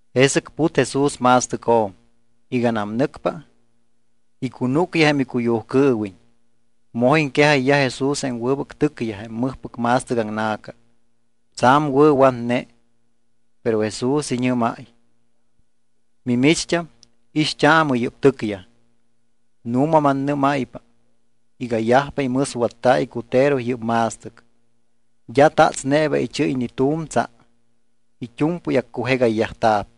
Jesɨc put Jesús ma̱stɨcjo̱m. Iganam nɨcpa, icunúcyaj jém icuyujcɨɨwiñ. Moj iŋquejayyaj Jesús jém wɨbɨc tɨcyaj jém mɨjpɨc ma̱stɨc aŋna̱ca, tsa̱m wɨ̱watne. Pero Jesús iñɨ́máy: —Mimicht́am, ixt́aamɨ yɨ́p tɨcyaj. Nu̱ma mannɨ́máypa iga yajpa imɨswatta̱ icutero yɨ́p ma̱stɨc, d́a tatsneeba ichɨ́y ni tu̱m tsa. It́u̱mpɨy accujegayyajta̱p.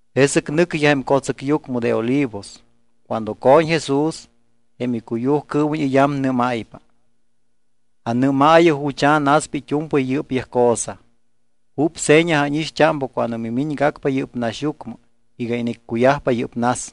Jesɨc nɨcyaj jém co̱tsɨcyucmɨ de Olivos. Cuando co̱ñ Jesús, jém icuyujcɨɨwiñ iyamnɨ́mayyajpa: —Anɨ́maayɨ jucha̱ naspa it́u̱mpɨy yɨ́pyaj cosa. ¿Júp seña ánixt́ámpa cuando mimiñgacpa yɨ́p naxyucmɨ iga iniccuyajpa yɨ́p nas?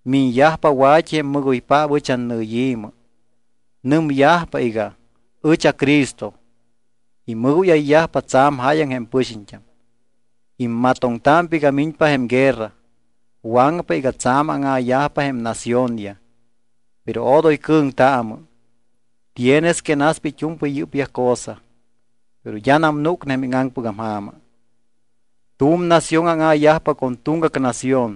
Miñyajpa wa̱t́i jém mɨgoypaap ɨch annɨyi̱mɨ. Nɨmyajpa iga: “Ɨch aCristo.” Imɨgóyayyajpa tsa̱m jáyaŋ jém pɨxiñt́am. Immatoŋtámpa iga miñpa jém guerra. Waŋpa iga tsa̱m áŋa̱yajpa jém naciónyaj. Pero odoy cɨ̱ŋtaamɨ. Tienes que naspa it́u̱mpɨy yɨ́pyaj cosa, pero d́anam núcne jém íŋaŋpɨgam ja̱ma. Tu̱m nación áŋa̱yajpa con tuŋgac nación.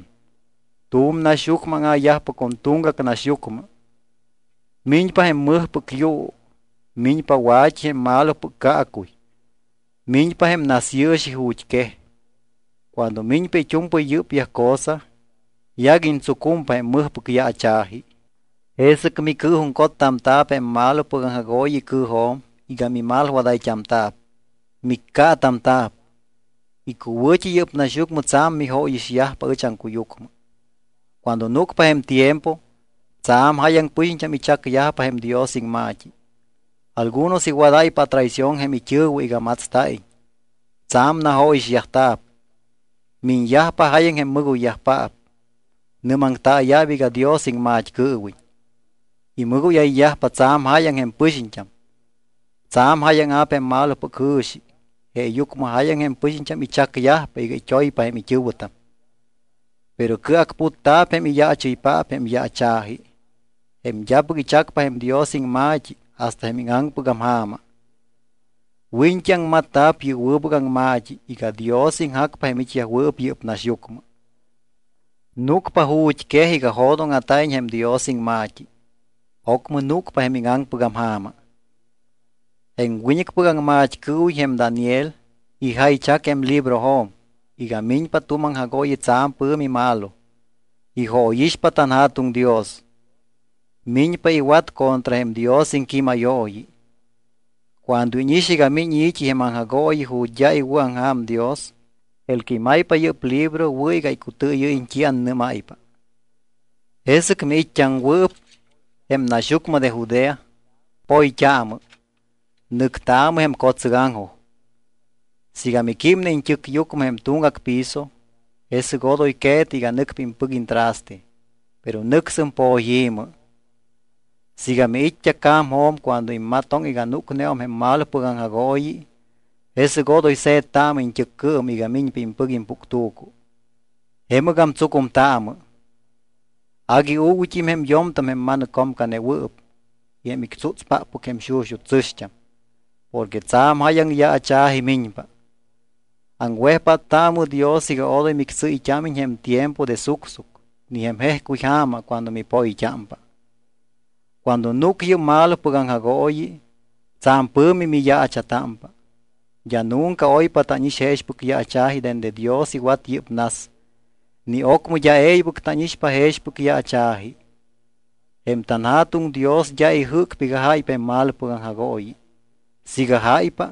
Tu̱m naxyucmɨ áŋa̱yajpa con tuŋgac naxyucmɨ. Miñpa jém mɨjpɨc yuu. Miñpa wa̱t́i jém malopɨc caacuy. Miñpa jém nasyɨɨxi ju̱t́ quej. Cuando miñpa it́u̱mpɨy yɨ́pyaj cosa, yaguiñ tsucumpa jém mɨjpɨc yaacha̱ji. ’Jesɨc micɨɨjuŋcottamta̱p jém malopɨc aŋjagooyi icɨɨjo̱m iga mimalwadayt́amta̱p. Miccaatamta̱p. Icuwɨ̱t́i yɨ́p naxyucmɨ tsa̱m mijóyixyajpa ɨch aŋcuyucmɨ. Cuando núcpa jém tiempo, tsa̱m jáyaŋ pɨxiñt́am ichacyajpa jém Dios iŋma̱t́i. Algunos iwadáypa atraición jém it́ɨ̱wɨ iga matsta̱iñ. Tsa̱m najóyixyajta̱p. Miñyajpa jáyaŋ jém mɨgoyyajpaap, nɨ́maŋtaaya̱p iga Dios iŋmat́cɨɨwiñ. Imɨgóyayyajpa tsa̱m jáyaŋ jém pɨxiñt́am. Tsa̱m jáyaŋa̱p jém malopɨc jɨ̱xi jeeyucmɨ jáyaŋ jém pɨxiñt́am ichacyajpa iga it́oypa jém it́ɨ̱wɨtam. Pero cɨacputta̱p jém iyaachɨypaap jém yaacha̱ji, jém d́apɨc ichacpa jém Dios iŋma̱t́i hasta jém íŋaŋpɨgam ja̱ma. Wiñt́i aŋmatta̱p yɨ́p wɨbɨc aŋma̱t́i iga Dios iŋjacpa jém it́yajwɨɨp yɨ́p naxyucmɨ. Núcpa ju̱t́quej iga jo̱dóŋa̱ta̱iñ jém Dios iŋma̱t́i. Ocmɨ núcpa jém íŋaŋpɨgam ja̱ma. ’Jém wiñɨcpɨc aŋmat́cɨɨwiñ jém Daniel ijaychac jém librojo̱m iga miñpa tu̱m aŋjagooyi tsa̱m pɨ̱mi malo, ijóyixpa tanJa̱tuŋ Dios. Miñpa iwat contra jém Dios iŋquímayooyi. Cuando íñix iga miñ i̱t́i jém aŋjagooyi ju̱t́ d́a iwɨ̱aŋja̱m Dios (el que imaypa yɨ́p libro wɨ̱ iga icutɨɨyɨ́yiñ t́i annɨ́máypa), jesɨc miit́t́aŋwɨɨp jém naxyucmɨ de Judea, poyt́aamɨ, nɨctaamɨ jém co̱tsɨgaŋjoj. Siiga miquímne iñt́ɨcyucmɨ jém tuŋgac piso, jesɨc odoy que̱tɨ iga nɨcpa impɨc iñtraste, pero nɨcsɨm poyi̱mɨ. Siiga miit́t́a ca̱mjo̱m cuando immatoŋ iga núcneum jém malopɨc aŋjagooyi, jesɨc odoy se̱ttaamɨ iñt́ɨccɨɨm iga miñpa impɨc impuctu̱cu. Jemɨgam tsucumtaamɨ. Agui uuguyt́im jém yo̱mtam jém ma̱nɨccomcanewɨɨp y jém ictsútspáppɨc jém xuxut́ tsɨ̱xt́am. Porque tsa̱m jáyaŋ yaacha̱ji miñpa. Aŋwejpáttaamɨ Dios iga odoy mictsɨ́yt́ámiñ jém tiempo de sucsuc ni jém jejcuy ja̱ma cuando mipoyt́ámpa. Cuando núc yɨ́p malopɨc aŋjagooyi, tsa̱m pɨ̱mi miyaacha̱támpa. D́a nunca oypa tánix jexpɨc yaacha̱ji dende Dios iwat yɨ́p nas. Ni ocmɨ d́a e̱ybɨc tánixpa jexpɨc yaacha̱ji. Jém tanJa̱tuŋ Dios d́a ijɨ́cpa iga jáypa jém malopɨc aŋjagooyi. Siiga jáypa,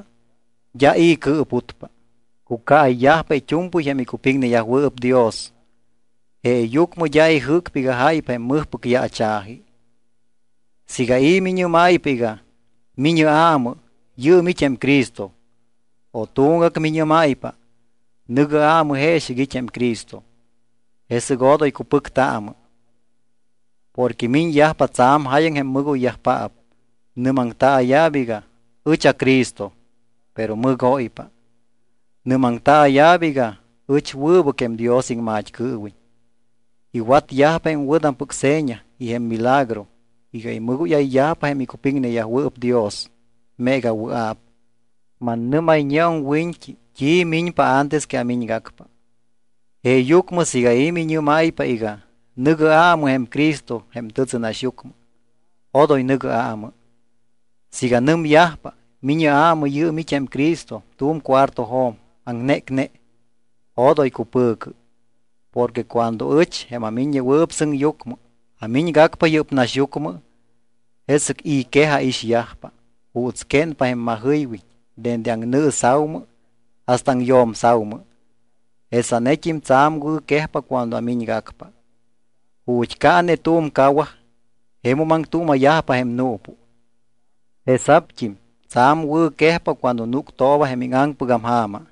d́a i̱ cɨɨputpa, cucaayyajpa it́u̱mpɨy jém icupiŋneyajwɨɨp Dios, jeeyucmɨ d́a ijɨ́cpa iga jáypa jém mɨjpɨc yaacha̱ji. ’Siiga i̱ miñɨ́máypa iga: “Mi̱ñɨ aamɨ, yɨɨm it́ jém Cristo”, o tuŋgac miñɨ́máypa: “Nɨ̱gɨ aamɨ jeexɨc it́ jém Cristo”, jesɨc odoy cupɨctaamɨ. Porque miñyajpa tsa̱m jáyaŋ jém mɨgoyyajpaap. Nɨ́maŋtaaya̱p iga: “Ɨch aCristo”, pero mɨgóypa. Nɨ́maŋtaaya̱p iga: “Ɨch awɨbɨc jém Dios iŋmat́cɨɨwiñ.” Iwatyajpa jém wɨ̱tampɨc seña y jém milagroyaj iga imɨgóyayyajpa jém icupiŋneyajwɨɨp Dios meega wɨa̱p. Mannɨ́mayñeum wiñt́i t́i miñpa antes que amiñgacpa. Jeeyucmɨ siiga i̱ miñɨ́máypa iga: “Nɨ̱gɨ aamɨ jém Cristo jém tɨtsɨnaxyucmɨ”, odoy nɨ̱gɨ aamɨ. Siiga nɨmyajpa: “Mi̱ñɨ aamɨ, yɨɨm it́ jém Cristo tu̱m cuartojo̱m aŋnécne”, odoy cupɨ̱cɨ. Porque cuando ɨch, jém aMiññewɨɨp Sɨŋyucmɨ, amiñgacpa yɨ́p naxyucmɨ, jesɨc i̱ quej aixyajpa. Juuts quénpa jém majɨywiñ dende aŋnɨɨsa̱umɨ hasta aŋyo̱msa̱umɨ, jesanet́im tsa̱m wɨ̱quejpa cuando amiñgacpa. Ju̱t́ caane tu̱m cawaj jemum aŋtuuma̱yajpa jém nuupu. Jesa̱pt́im tsa̱m wɨ̱quejpa cuando núctooba jém íŋaŋpɨgam ja̱ma.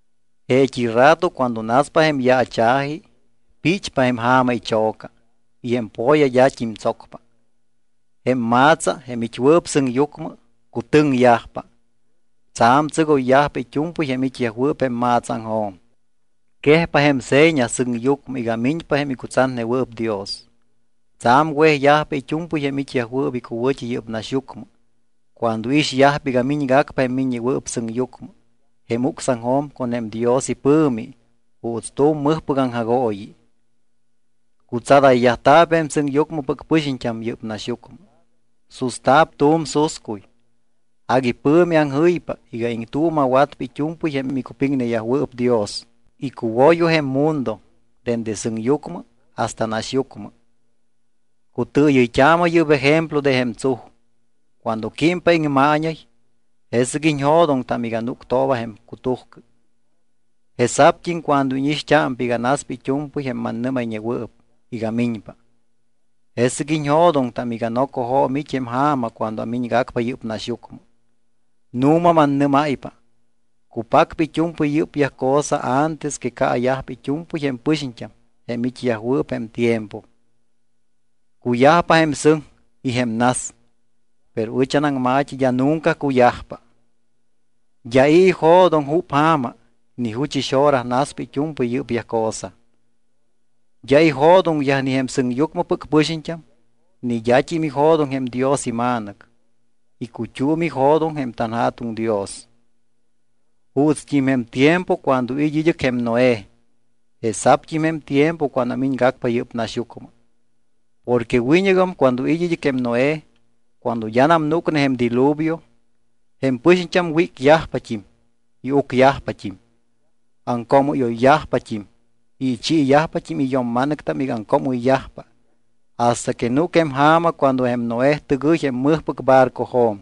’Jeet́i rato cuando naspa jém yaacha̱ji, píchpa jém ja̱ma icho̱ca y jém po̱ya d́at́im tsocpa. Jém ma̱tsa, jém it́wɨɨp sɨŋyucmɨ, cutɨŋyajpa. Tsa̱m tsɨgoyyajpa it́u̱mpɨy jém it́yajwɨɨp jém ma̱tsaaŋjo̱m. Quejpa jém seña sɨŋyucmɨ iga miñpa jém icutsatnewɨɨp Dios. Tsa̱m wejyajpa it́u̱mpɨy jém it́yajwɨɨp icuwɨ̱t́i yɨ́p naxyucmɨ cuando iixyajpa iga miñgacpa jém Miññewɨɨp Sɨŋyucmɨ jém ucsaŋjo̱m con jém Dios ipɨ̱mi juuts tu̱m mɨjpɨc aŋjagooyi. Cutsadayyajta̱p jém sɨŋyucmɨpɨc pɨxiñt́am yɨ́p naxyucmɨ. Susta̱p tu̱m suscuy. Agui pɨ̱mi aŋjɨypa iga iŋtuuma̱watpa it́u̱mpɨy jém icupɨŋneyajwɨɨp Dios icuwoyo jém mundo dende sɨŋyucmɨ hasta naxyucmɨ. ’Cutɨɨyɨyt́aamɨ yɨ́p ejemplo de jém tsuj. Cuando químpa jém iŋmaañay, jesɨc iñjo̱doŋtam iga núctooba jém cutujcɨ. Jesa̱pt́im cuando íñixt́ámpa iga naspa it́u̱mpɨy jém mannɨ́mayñewɨɨp iga miñpa, jesɨc iñjo̱doŋtam iga nocojo̱m it́ jém ja̱ma cuando amiñgacpa yɨ́p naxyucmɨ. Nu̱ma mannɨ́máypa, cupacpa it́u̱mpɨy yɨ́pyaj cosa antes que caayajpa it́u̱mpɨy jém pɨxiñt́am jém it́yajwɨɨp jém tiempo. Cuyajpa jém sɨŋ y jém nas, pero ɨch anaŋma̱t́i d́a nunca cuyajpa. ’D́a i̱ ijo̱doŋ júp ja̱ma ni juchɨs hora naspa it́u̱mpɨy yɨ́pyaj cosa. D́a ijo̱doŋyaj ni jém sɨŋyucmɨpɨc pɨxiñt́am ni d́at́im ijo̱doŋ jém Dios iMa̱nɨc. Icut́um ijo̱doŋ jém tanJa̱tuŋ Dios. ’Juutst́im jém tiempo cuando it́ id́ɨc jém Noé, jesa̱pt́im jém tiempo cuando amiñgacpa yɨ́p naxyucmɨ. Porque wiñɨgam cuando it́ id́ɨc jém Noé, cuando d́anam núcne jém diluvio, jém pɨxiñt́am wícyajpat́im y ucyajpat́im. Aŋcoomɨ́yoyyajpat́im y ichiiyajpat́im iyo̱mma̱nɨctam iga aŋcoomɨyyajpa hasta que núc jém ja̱ma cuando jém Noé tɨgɨy jém mɨjpɨc barcojo̱m.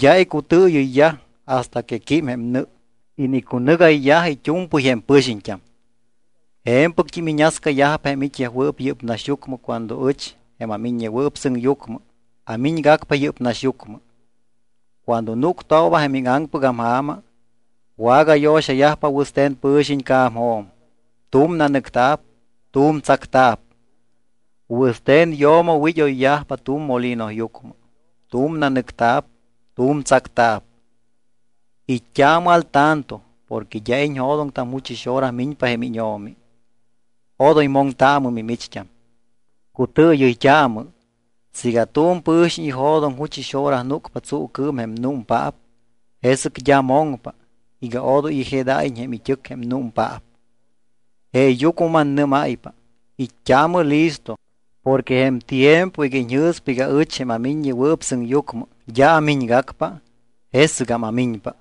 D́a icutɨɨyɨyyaj hasta que quím jém nɨ, inicunɨ́gayyaj it́u̱mpɨy jém pɨxiñt́am. Je̱mpɨct́im iñascayajpa jém it́yajwɨɨp yɨ́p naxyucmɨ cuando ɨch, jém aMiññewɨɨp Sɨŋyucmɨ, amiñgacpa yɨ́p naxyucmɨ. Cuando núctooba jém íŋaŋpɨgam ja̱ma, wagayo̱xayajpa wɨste̱n pɨ̱xiñ ica̱mjo̱m, tu̱m nanɨcta̱p, tu̱m tsacta̱p. Wɨste̱n yo̱mo wid́oyyajpa tu̱m molinoyucmɨ, tu̱m nanɨcta̱p, tu̱m tsacta̱p. ’It́t́aamɨ al tanto porque d́a iñjo̱doŋtam juchɨs hora miñpa jém íñO̱mi, odoy moŋtaamɨ mimicht́am. Cutɨɨyɨyt́aamɨ, siiga tu̱m pɨ̱xiñ ijo̱doŋ juchɨs hora núcpa tsuucɨɨm jém númpaap, jesɨc d́a moŋpa iga odoy ijedáyiñ jém it́ɨc jém númpaap. Jeeyucmɨ mannɨ́máypa, it́t́aamɨ listo porque jém tiempo iga iñjɨ̱spa iga ɨch, jém aMiññewɨɨp Sɨŋyucmɨ, d́a amiñgacpa, jesɨgam amiñpa.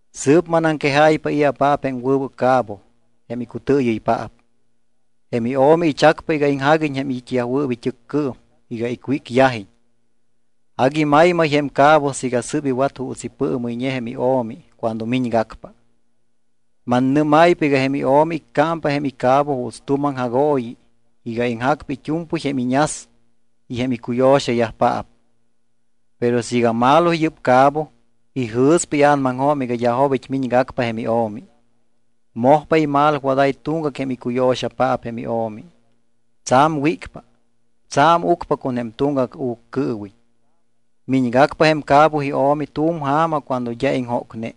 ’Sɨɨp manaŋquejáypa i̱apaap jém wɨbɨc cabo jém icutɨɨyɨypaap. Jém io̱mi ichacpa iga iŋjaguiñ jém it́yajwɨɨp it́ɨccɨɨm iga icwícyajiñ. Agui maymay jém cabo siiga sɨ́p iwat juuts ipɨɨmɨyñe jém io̱mi cuando miñgacpa. Mannɨ́máypa iga jém io̱mi iccámpa jém icabo juuts tu̱m aŋjagooyi iga iŋjacpa it́u̱mpɨy jém iñas y jém icuyo̱xayajpaap. Pero siiga malo yɨ́p cabo, ijɨ̱spa ia̱namaŋjo̱m iga d́a jobit́ miñgacpa jém io̱mi. Mojpa imalwadáy tuŋgac jém icuyo̱xapaap jém io̱mi. Tsa̱m wícpa, tsa̱m ucpa con jém tuŋgac uccɨɨwiñ. Miñgacpa jém cabo io̱mi tu̱m ja̱ma cuando d́a iŋjócne.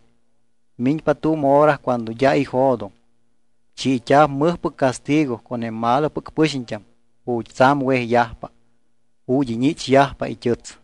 Miñpa tu̱m hora cuando d́a ijo̱doŋ. Chiit́a̱p mɨjpɨc castigo con jém malopɨc pɨxiñt́am ju̱t́ tsa̱m wejyajpa, ju̱t́ iñichyajpa it́ɨts.